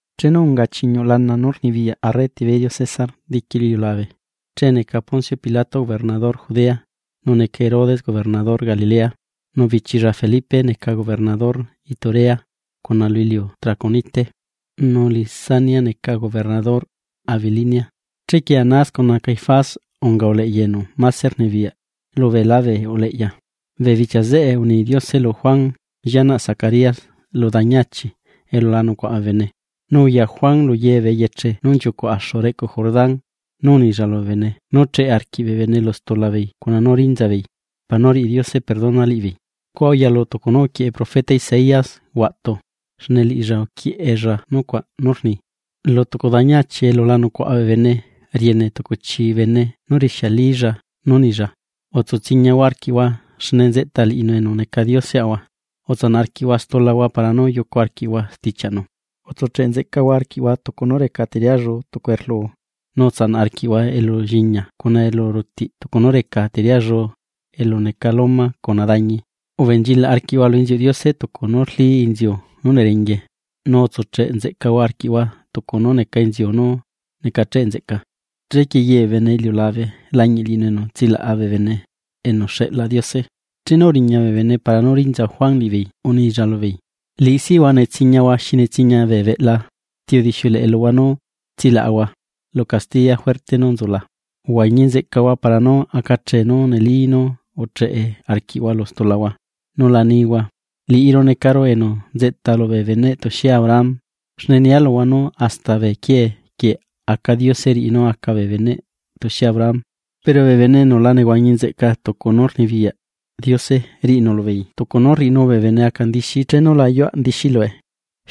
Chenu unga chiñuꞌ lana nú rnibiyaꞌ arre Tiberio César diqui lu iliulabe, che neca Poncio Pilato gobernador Judea, nu neca Herodes gobernador Galilea, nu bichilla Felipe neca gobernador Iturea cuna lu iliu Traconite, nu Lisanias neca gobernador Abilinia. Chequie Anás cuna Caifás unga uleꞌya enu mase rnibiyaꞌ lu beelá bee uleꞌya. Bee bichia zeꞌe uni Diose lu Juan llianaꞌ Zacarías lu dañi achi elu la nucuaꞌa bee bene. Nu uya Juan lu ye bee eyeche nú nchiucuꞌ axu reꞌcu Jordán, nu unilla lubee bene nú cheꞌe arquiꞌ bee bene lu stula beei cuna nú rinza beei, para nú riꞌi Diose perdona liꞌibeei. Scua uyalu tucu nú uquieꞌe profeta Isaías huaꞌtu, xne liꞌilla uquieꞌella nucuaꞌ nú rni: Lu tucu dañi achi elu la nucuaꞌa bee bene, riene tucu chii bene nu rixialilla nú nilla: “Utsu tsiñahua arquiꞌhua xne nzeꞌta liꞌinu enu neca Dioseꞌahua; utsanaꞌ arquiꞌhua stulahua para nú yucu arquiꞌhua stichiaꞌnu. Utsucheꞌ nzeꞌcahua arquiꞌhua tucu nú reca teriallu tucu erluu, nu utsanaꞌ arquiꞌhua elulliña cuna elurutiꞌ tucu nú reca teriallu elu neca loma cuna dañi, ubenchilaꞌ arquiꞌhua lu inziuꞌ Diose tucu nú rlí inziu nú nerenguie, nu utsucheꞌ nzeꞌcahua arquiꞌhua tucu nú neca inziu nú necacheꞌ nzeꞌca. Chequie ye bee bene iliulabe lañiꞌ liꞌinu enu tsilaꞌa bee bene, enu xeꞌla Diose.” Chenu uriña bee bene para nú rinza Juan liꞌibeei unilla lubeei: ―¡Liꞌi sihua netsiñahua xi netsiña bee beꞌla! ¿Ti udixiuleꞌe luhua nú tsilaꞌahua lu castiya juerte nú nzula? Uhuañi nzeꞌcahua para nú acachee nú neli nú ucheꞌe arquiꞌhua lu stulahua, nu la nihua: “Liꞌiru necaru enu nzeꞌta lubee beneꞌ tuxie Abraham”; xne nia luhua nú hasta bee quiee quieꞌ aca Diose riꞌi nú aca bee beneꞌ tuxie Abraham. Pero bee bene enu la nehuañi nzeꞌca tucu nú rnibiyaꞌ Diose, riꞌinu lubeei tucu nú rriꞌinu bee bene aca ndixi chenu la ayuaꞌ ndixí lue.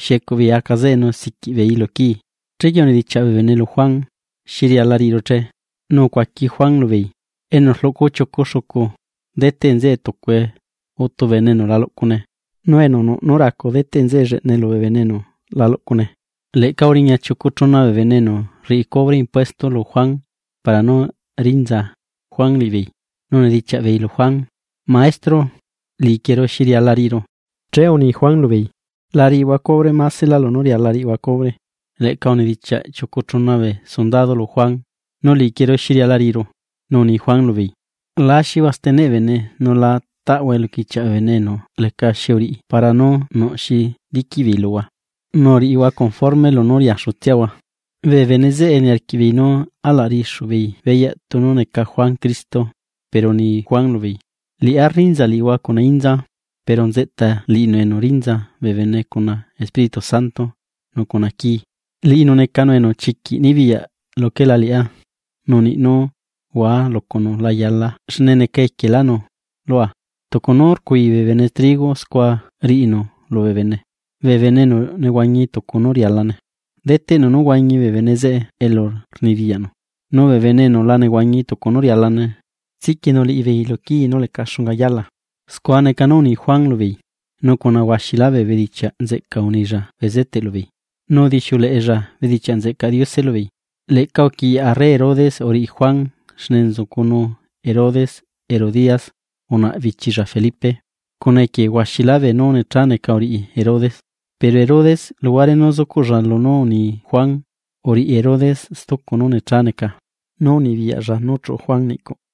Xiecuꞌ beei aca zeꞌe nu siquiꞌ beeii lu quii. Chequie unidichiaꞌ bee bene lu Juan: ―¿Xi riala riꞌiru che? Nu ucuaqui Juan lubeei: ―Enu rluꞌcu chiucu xucu, deteꞌnzeꞌe tucue utu bene enu la luꞌcune, nu enu nuꞌ nú racu deteꞌ nzeꞌe lleꞌnae lubee bene enu seca laꞌchaꞌe. Leꞌca uriña chiucu chuna bee bene enu rriꞌi cubre impuestos lu Juan para nú rinza Juan liꞌibeei, nu unidichiaꞌ beei lu Juan: ―Maestro, liꞌiquieru ¿xi riala riꞌiru? Che uni Juan lubeei: ―La riꞌihua cubre maselá lunú riala rriꞌihua cubre. Leꞌca unidichiaꞌ chiucu chuna bee sundado lu Juan: ―¿Nu liꞌiquieru xi riala riꞌiru? Nu uni Juan lubeei: ―La axihua steneꞌ bee bene, nu la taꞌhua eluquichiaꞌ bee bene enu lecaxi uriꞌi para nú nuꞌ xi liquiꞌ beei luhua, nu uriꞌihua conforme lunú riaxutsiahua. Bee bene zeꞌe niarquiꞌ beei nú alaꞌ riꞌixu beei beyaꞌ tunu neca Juan Cristo, pero uni Juan lubeei: ―Liꞌá rrinza liꞌihua cuna inza. Pero nzeꞌta liꞌinu enu rinza bee bene cuna Espíritu Santo nu cuna quii. Liꞌinu necanu enu chiquiꞌ nibiyaꞌ luquelá liꞌá, nu niꞌ nú hua lucunu la yala xne neca equielánu lua. Tucu nú rcui bee bene trigo, scua riꞌinu lubee bene, bee bene enu nehuañi tucu nú rialane, deteꞌnu nú huañi bee bene zeꞌe elu rnibiyaꞌnu, nu bee bene enu la nehuañi tucu nú rialane, xeꞌlanu liꞌibeei lu quii nú leca xunga yala. Scua neca nú uni Juan lubeei, nu cuna huaxilá bee bedichiaꞌ nzeꞌca unilla bezeteꞌ lubeei, nu udixiuleꞌella bedichiaꞌ nzeꞌcaꞌ Diose lubeei. Leꞌca uquiꞌyaꞌ arre Herodes uriꞌi Juan, xne nzucunu Herodes Herodías unaꞌa bichilla Felipe, cuna equie huaxilá beenú necha neca uriꞌi Herodes. Pero Herodes luhuare nú zucuꞌlla lunú uni Juan, uriꞌi Herodes stucu nú necha neca: Nú uduꞌlla Juan niꞌcuꞌ.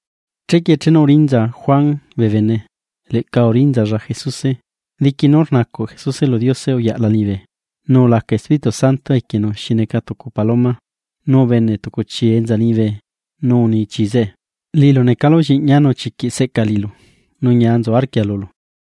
Chequie chenu urinza Juan bee bene, leꞌca urinzalla Jesuse, diqui nú rnacuꞌ Jesuse lu Diose uyaꞌla liñibe. Nu ulaca Espíritu Santo equienu xi neca tucu paloma, nu ubene tucu chii enza liñibe nu uni chii zeꞌe: ―Liꞌilu necalu Lliꞌñia nu chiquiꞌ seꞌca liꞌilu nu ñia nzu arquia lulu.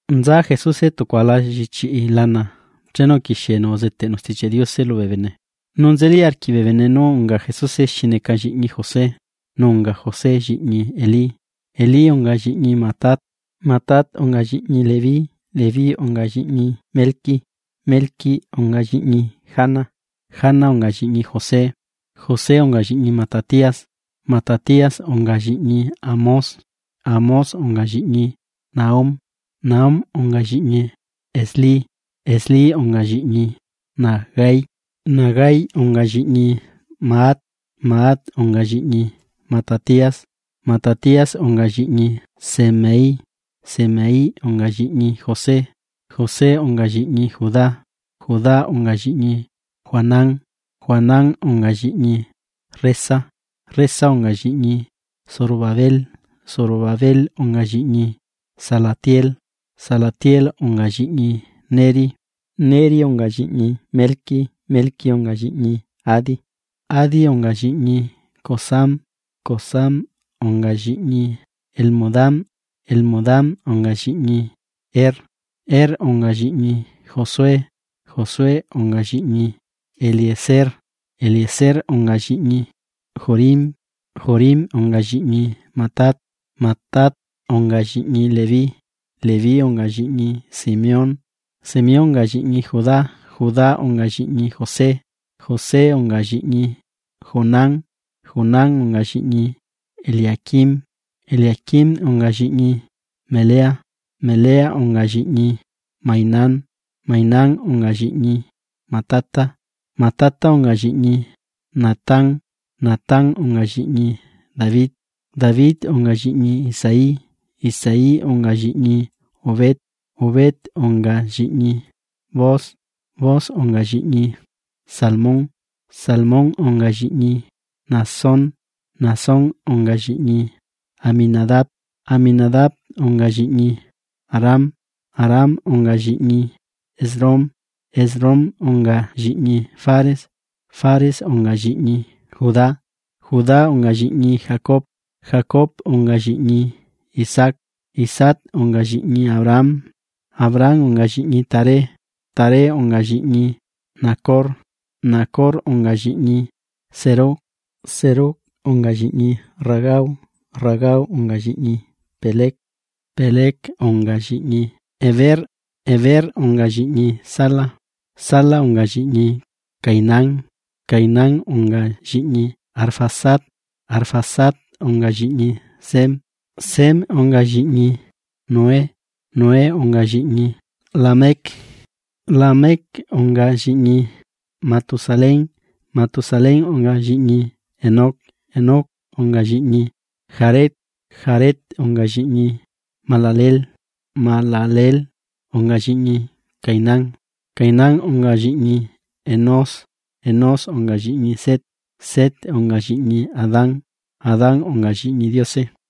Nza Jesuse tucu ala llichiꞌi lana chenu uquixienu uzeteꞌnu Stichiaꞌ Diose lubee bene. Nu nzeli arquiꞌ bee bene nú unga Jesuse xi neca lliꞌñi José. Nu unga José, lliñi Elí, Elí unga lliꞌñi Matat, Matat unga lliꞌñi Leví, Leví unga lliꞌñi Melqui, Melqui unga lliꞌñi Jana, Jana unga lliꞌñi José, José unga lliꞌñi Matatías, Matatías unga lliꞌñi Amós, Amós unga lliꞌñi Nahum, Nahum unga lliꞌñi Esli, Esli unga lliꞌñi Nagai. Nagai unga lliꞌñi Maat, Maat unga lliꞌñi Matatías, Matatías unga lliꞌñi Semei, Semei unga lliꞌñi José, José unga lliꞌñi Judá. Judá unga lliñi Joanán, Joanán unga lliꞌñi Resa, Resa unga lliꞌñi Zorobabel, Zorobabel unga lliꞌñi Salatiel, Salatiel unga lliꞌñi Neri. Neri unga lliꞌñi Melqui, Melqui unga lliꞌñi Adi, Adi unga lliꞌñi Cosam, Cosam unga lliꞌñi Elmodam, Elmodam unga lliꞌñi Er. Er unga lliꞌñi Josué, Josué unga lliꞌñi Eliezer, Eliezer unga lliꞌñi Jorim, Jorim unga lliꞌñi Matat. Matat unga lliꞌñi Leví, Leví unga lliꞌñi Simeón, Simeón unga lliꞌñi Judá, Judá unga lliꞌñi José, José unga lliꞌñi Jonán, Jonán unga lliꞌñi Eliaquim, Eliaquim unga lliꞌñi Melea, Melea unga lliꞌñi Mainán, Mainán unga lliꞌñi Matata, Matata unga lliꞌñi Natán, Natán unga lliꞌñi David, David unga lliꞌñi Isaí, Isaí unga lliꞌñi Obed, Obed unga lliꞌñi Booz, Booz unga lliꞌñi Salmón, Salmón unga lliñi Naasón, Naasón unga lliꞌñi Aminadab, Aminadab unga lliꞌñi Aram, Aram unga lliꞌñi Esrom, Esrom unga lliꞌñi Fares, Fares unga lliꞌñi Judá, Judá unga lliꞌñi Jacob, Jacob unga lliꞌñi Isaac, Isaac unga lliꞌñi Abraham, Abraham unga lliꞌñi Taré, Taré unga lliꞌñi Nacor, Nacor unga lliꞌñi Serug, Serug unga lliꞌñi Ragau, Ragau unga lliꞌñi Peleg, Peleg unga lliꞌñi Heber, Heber unga lliꞌñi Sala, Sala unga lliꞌñi Cainán, Cainán unga lliꞌñi Arfaxad, Arfaxad unga lliꞌñi Sem, Sem unga lliꞌñi Noé, Noé unga lliꞌñi Lamec, Lamec unga lliꞌñi Matusalén, Matusalén unga lliꞌñi Enoc, Enoc unga lliꞌñi Jared, Jared unga lliꞌñi Mahalaleel, Mahalaleel unga lliꞌñi Cainán, Cainán unga lliꞌñi Enós, Enós unga lliꞌñi Set, Set unga lliꞌñi Adán, Adán unga lliꞌñi Diose.